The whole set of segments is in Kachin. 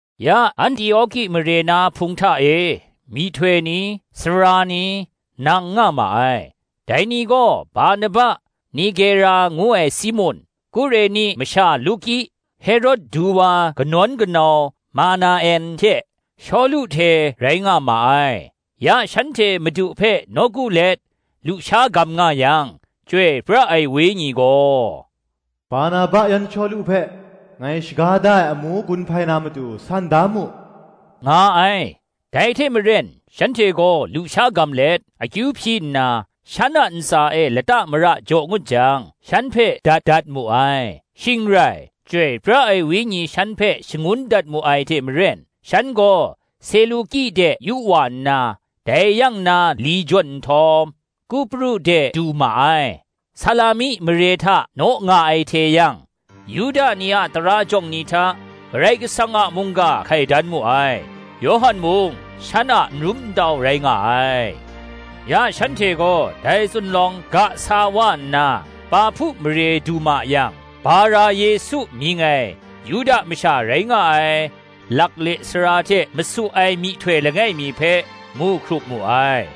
Ya, Antioki mare na Hpung hta e, myihtoi ni, sara ni, nang nga ma ai: dai ni gaw, Barnaba, Nigera ngu ai Simun, Kureni masha Luki, Herod du wa kanawn kanau Manaen hte Shawlu hte rai nga ma ai. Ya shanhte Madu hpe nawku let lusha gam nga yang, Chyoi pra ai Wenyi gaw, “Barnaba yan Shawlu hpe, ngai shaga da ai amu gun hpai na matu, san da mu,” nga ai. Dai hte maren shanhte gaw lusha gam let, akyu hpyi nna, shan a ntsa e lata mara jaw ngut jang, shan hpe dat mu ai. Shing rai, Chyoi pra ai Wenyi shan hpe shangun dat mu ai hte maren, shan gaw Seluki de yu wa nna, dai yang na li jawn nhtawm, Kupru de du ma ai. Salami mare hta naw nga ai hte yang, Yuda ni a tara jawng ni hta, Karai Kasang a mungga hkai dan mu ai; Yawhan mung shan a nrum ntau rai nga ai. Ya shanhte gaw dai zunlawng ga sa wa nna Pahpu mare du ma yang, Bara-Yesu mying ai Yuda masha rai nga ai lakle sara hte masu ai myihtoi langai mi hpe, mu hkrup mu ai;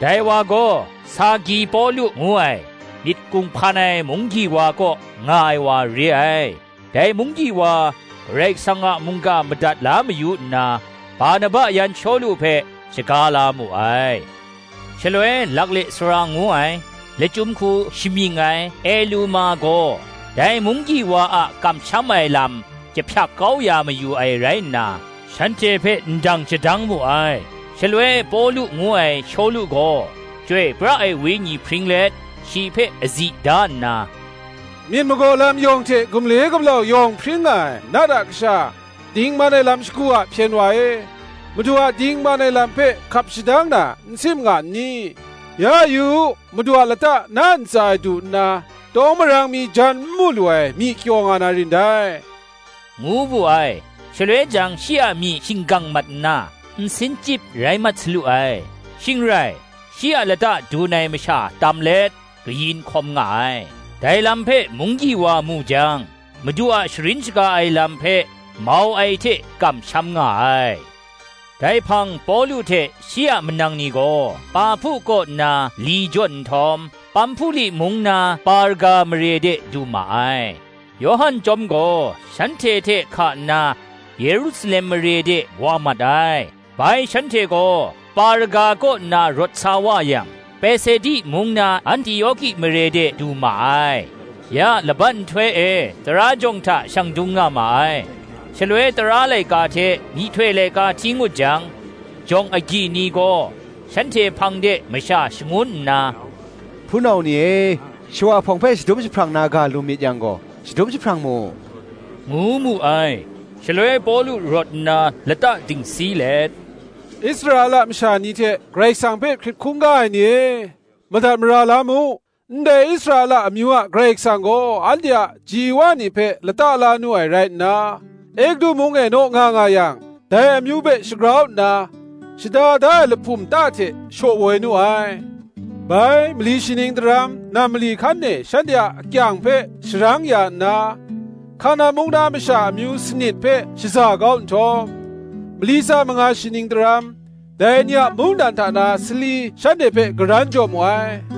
dai wa gaw, Sergi Pawlu ngu ai, myit kunghpan ai munggyi wa kaw nga ai wa re ai. Dai munggyi wa Karai Kasang a mungga madat la mayu nna, Barnaba yan Shawlu hpe shaga la mu ai. Shaloi lakle sara ngu ai, lachyum hku shamying ai, Eluma gaw, dai munggyi wa a kamsham ai lam jahpyak kau ya mayu ai rai nna, shanhte hpe ndang shadang mu ai. Shaloi Pawlu ngu ai Shawlu gaw, Chyoi pra ai Wenyi hpring let, shi hpe azi da nna, “Myit magaw lam yawng hte gumle gumlau yawng hpring nga ai, nat a kasha, dingman ai lam shagu a hpyen wa e, Madu a dingman ai lam hpe hkap shadang na n sim nga n ni? Ya, yu u, Madu a lata na ntsa e du nna, tawng marang mi jan n mu lu ai, myi kyaw nga na rin dai,” ngu wu ai. Shaloi jang shi a myi shinggang mat nna, nsin chyip rai mat salu ai; shing rai, shi a lata dun ai masha tam let, kayin hkawm nga ai. Dai lam hpe munggyi wa mu jang, Madu a sharin shaga ai lam hpe mau ai hte kamsham nga ai. Dai hpang Pawlu hte shi a manang ni gaw, Pahpu kaw nna li jawn nhtawm, Pamhpuli mung na Perga mare de du ma ai: Yawhan chyawm gaw shanhte hte hka nna, Yerusalem mare de wa mat ai. Bai, shanhte gaw Perga kaw nna rawt sa wa yang, Pesidi mung na Antioki mare de du ma ai: ya laban nhtoi e tara jawng hta shang dung nga ma ai. Shaloi tara laika hte myihtoi laika hti ngut jang, jawng agyi ni gaw shanhte hpang de masha shangun nna, “Hpunau ni e, shawa hpawng hpe shadum jahprang na ga lu myit yang gaw, shadum jahprang mu,” ngu mu ai. Shaloi Pawlu rawt nna lata dingsi let, “Israela masha ni hte Karai Kasang hpe hkrit hkungga ai ni e, madat mara la mu. Ndai Israela amyu a Karai Kasang gaw, anhte a ji wa ni hpe lata la nu ai rai nna, Egutu mung e naw nga nga yang, dai amyu hpe shagrau nna, shada da ai lahpum ta hte shaw woi nu ai. Bai, mali shi ning daram, nam mali hkan e shanhte a akyang hpe sharang ya nna, Hkanan mung na masha amyu sanit hpe shaza kau nhtawm, mali tsa manga shi ning daram, dai ni a mungdan hta na sali shanhte hpe karan jaw mu ai: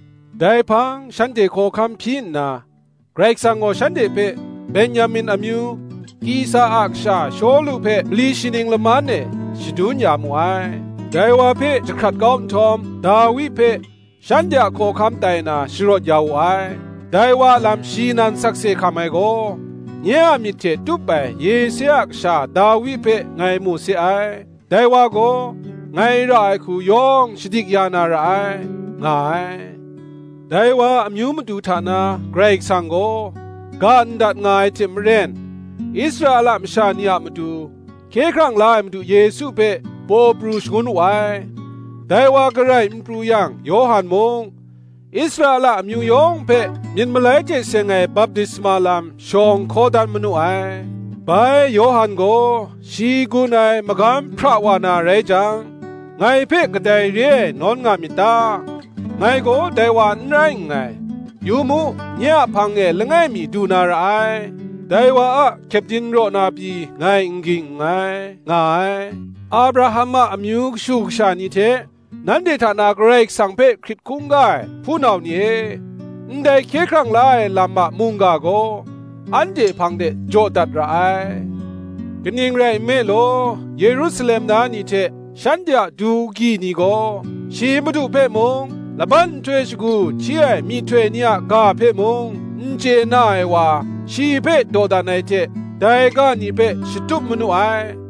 Dai hpang shanhte hkawhkam hpyi nna, Karai Kasang gaw shanhte hpe, Ben-yamin amyu, Kisa a kasha Shawlu hpe mali shi ning laman e, shadun ya mu ai. Dai wa hpe jahkrat kau nhtawm, Dawi hpe, shanhte a hkawhkam tai na sharawt ya wu ai: dai wa a lam shi nan sakse hkam ai gaw, ‘Nye a myit hte tup ai Yese a kasha Dawi hpe ngai mu se ai; dai wa gaw, ngai ra ai hku yawng shadik ya na ra ai,’ nga ai. Dai wa a amyu matu hta na, Karai Kasang gaw, ga ndat nga ai hte maren, Israela masha ni a matu, Hkye hkrang la ai Madu Yesu hpe, paw pru shangun wu ai. Dai wa garai n pru yang Yawhan mung, Israela amyu yawng hpe myit malai hte seng ai baptisma lam shawng hkaw dan manu ai. Bai Yawhan gaw shi gun ai magam hpra wa na rai jang, ‘Ngai hpe kadai re ai nawn nga myit ta? Ngai gaw dai wa n rai nngai; yu mu, nye a hpang e langai mi du na ra ai; dai wa a kyepdin raw na pyi ngai n ging nngai,’ nga ai. Abraham a amyu kashu kasha ni hte, nanhte hta na Karai Kasang hpe hkrit hkungga ai, hpunau ni e, ndai hkye hkrang la ai lam a mungga gaw, anhte hpang de jaw dat ra ai. Kaning rai nme law, Yerusalem na ni hte, shanhte a du gyi ni gaw, shi madu hpe mung, laban nhtoi shagu hti ai myihtoi ni a ga hpe mung, n chye na ai wa, shi hpe dawdan ai hte dai ga ni hpe shatup manu ai.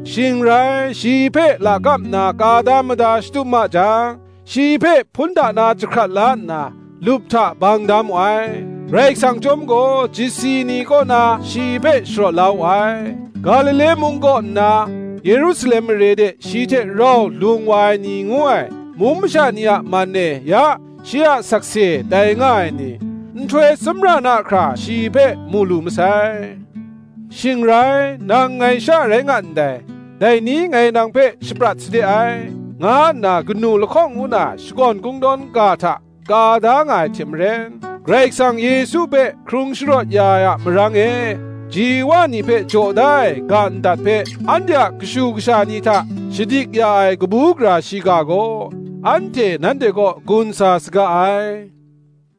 Shing rai, shi hpe lakap nna ka da mada shatup ma jang, shi hpe hpun hta na jahkrat la nna, lup hta bang da mu ai. Karai Kasang chyawm gaw, chyasi ni kaw na shi hpe sharawt la wu ai: Galile mung kaw nna Yerusalem mare de shi hte rau lung wa ai ni ngu ai, mung masha ni a man e ya shi a sakse tai nga ai ni, nhtoi tsawmra na hkra shi hpe mu lu masai. Shing rai, ‘Nang ngai sha rai nga ndai, dai ni ngai nang hpe shaprat sade ai,’ nga nna kanu lahkawng ngu na Shakawn Kungdawn ga hta ka da nga ai hte maren, Karai Kasang Yesu hpe hkrung sharawt ya ai a marang e, ji wa ni hpe jaw da ai ga ndat hpe, anhte a kashu kasha ni hta shadik ya ai kabu gara shiga gaw, nanhte kaw gun sa saga ai.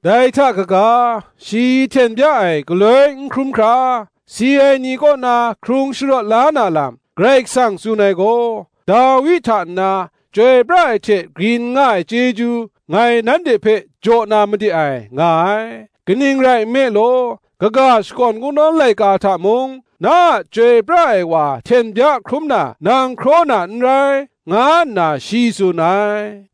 Dai hta kaga, shi hten bya ai galoi n hkrum hkra, si ai ni kaw na hkrung sharawt la na lam, Karai Kasang tsun ai gaw, Dawi hta nna, chyoi pra ai hte grin nga ai chyeju, ngai nanhte hpe jaw na made ai, nga ai. Kaning rai nme law, kaga Shakawn Kungdawn laika hta mung, ‘Na a Chyoi pra ai wa hten bya hkrum na nang hkraw na n rai,’ nga nna shi tsun ai.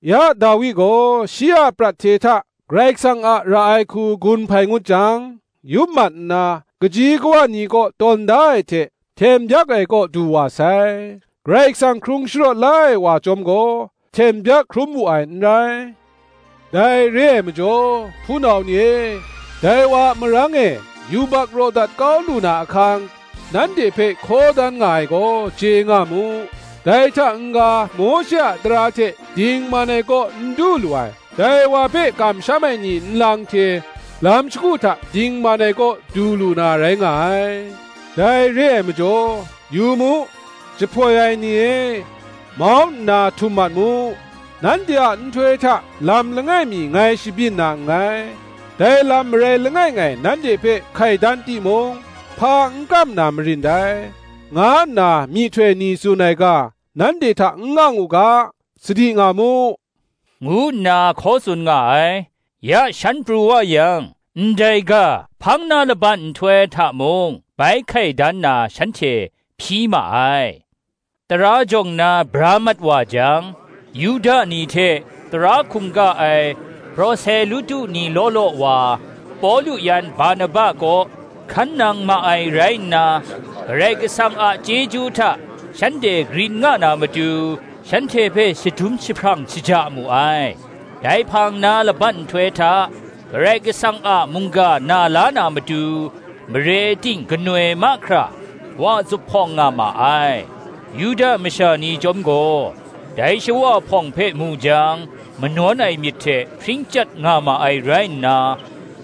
Ya Dawi gaw, shi a prat hte hta Karai Kasang a ra ai hku gun hpai ngut jang, yup mat nna, kaji kawa ni kaw tawn da ai hte, hten byak ai kaw du wa sai; Karai Kasang hkrung sharawt la ai wa chyawm gaw, hten byak hkrum wu ai n rai. Dai re ai majaw, hpunau ni e, dai wa a marang e, yubak raw dat kau lu na ahkang, nanhte hpe hkaw dan nga ai gaw, chye nga mu: dai hta n-ga, Mawshe a tara hte dingman ai kaw n du lu ai, dai wa hpe kamsham ai ni nlang hte lam shagu hta dingman ai kaw du lu na rai nga ai. Dai re ai majaw, ‘Yu mu, jahpoi ai ni e, mau nna htum mat mu: Nanhte a nhtoi hta lam langai mi ngai shabyin na nngai; Dai lam marai langai ngai nanhte hpe hkai dan timung, hpa n kam na marin dai,' nga nna myihtoi ni tsun ai ga, nanhte hta n ang u ga, sadi nga mu,” ngu nna hkaw tsun nga ai. Ya shan pru wa yang, ndai ga hpang na laban nhtoi hta mung bai hkai dan na shanhte hpyi ma ai. Tara jawng na bra mat wa jang, Yuda ni hte tara hkungga ai proselutu ni law law wa, Pawlu yan Barnaba kaw hkan nang ma ai rai nna, Karai Kasang a chyeju hta shanhte grin nga na matu, shanhte hpe shadum jahprang shaja mu ai. Dai hpang na laban nhtoi hta, Karai Kasang a mungga na la na matu, mare ting ganoi mahkra, wa zuphpawng nga ma ai. Yuda masha ni chyawm gaw dai shawa hpawng hpe mu jang, manawn ai myit hte hpring chyat nga ma ai rai nna,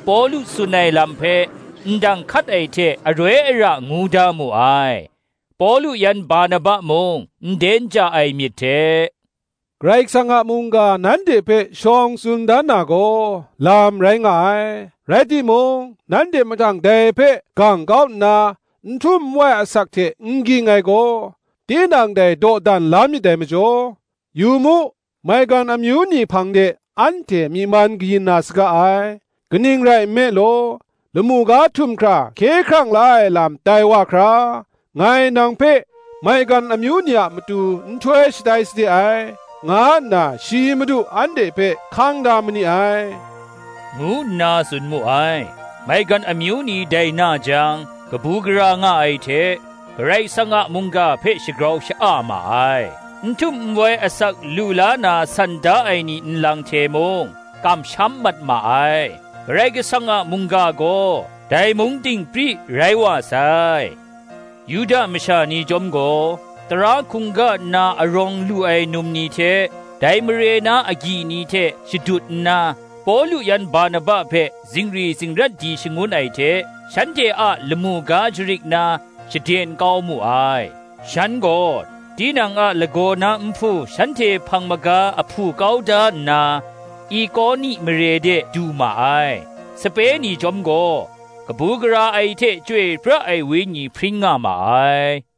Pawlu tsun ai lam hpe ndang hkat ai hte aroi ara ngu da mu ai. Pawlu yan Barnaba mung nden ja ai myit hte, “Karai Kasang a mungga nanhte hpe shawng tsun dan na gaw, lam rai nga ai; rai timung, nanhte mahtang dai hpe gang kau nna, n htum n wai asak hte n ging ai gaw, tinang dai dawdan la myit dai majaw, yu mu, maigan amyu ni hpang de anhte myi man kayin na saga ai. Kaning rai nme law, ‘Lamu ga htum hkra hkye hkrang la ai lam tai wa hkra, Ngai nang hpe, maigan amyu ni a matu nhtoi shatai sade ai,' nga nna shi Madu anhte hpe hkang dat mani ai,” ngu nna tsun mu ai. Maigan amyu ni dai na jang, kabu gara nga ai hte, Karai Kasang a mungga hpe shagrau sha-a ma ai: n htum n wai asak lu la na san da ai ni nlang hte mung, kamsham mat ma ai. Karai Kasang a mungga gaw dai mung ting pri rai wa sai. Yuda masha ni chyawm gaw, tara hkungga nna arawng lu ai num ni hte, dai mare na agyi ni hte shadut nna, Pawlu yan Barnaba hpe zingri zingrat di shangun ai hte, shanhte a lamu ga jarit na shaden kau mu ai. Shan gaw tinang a lagaw na nhpu shanhte hpang maga ahpu kau da nna, Ikoni mare de du ma ai. Sape ni chyawm gaw, kabu gara ai hte Chyoi pra ai Wenyi hpring nga ma ai.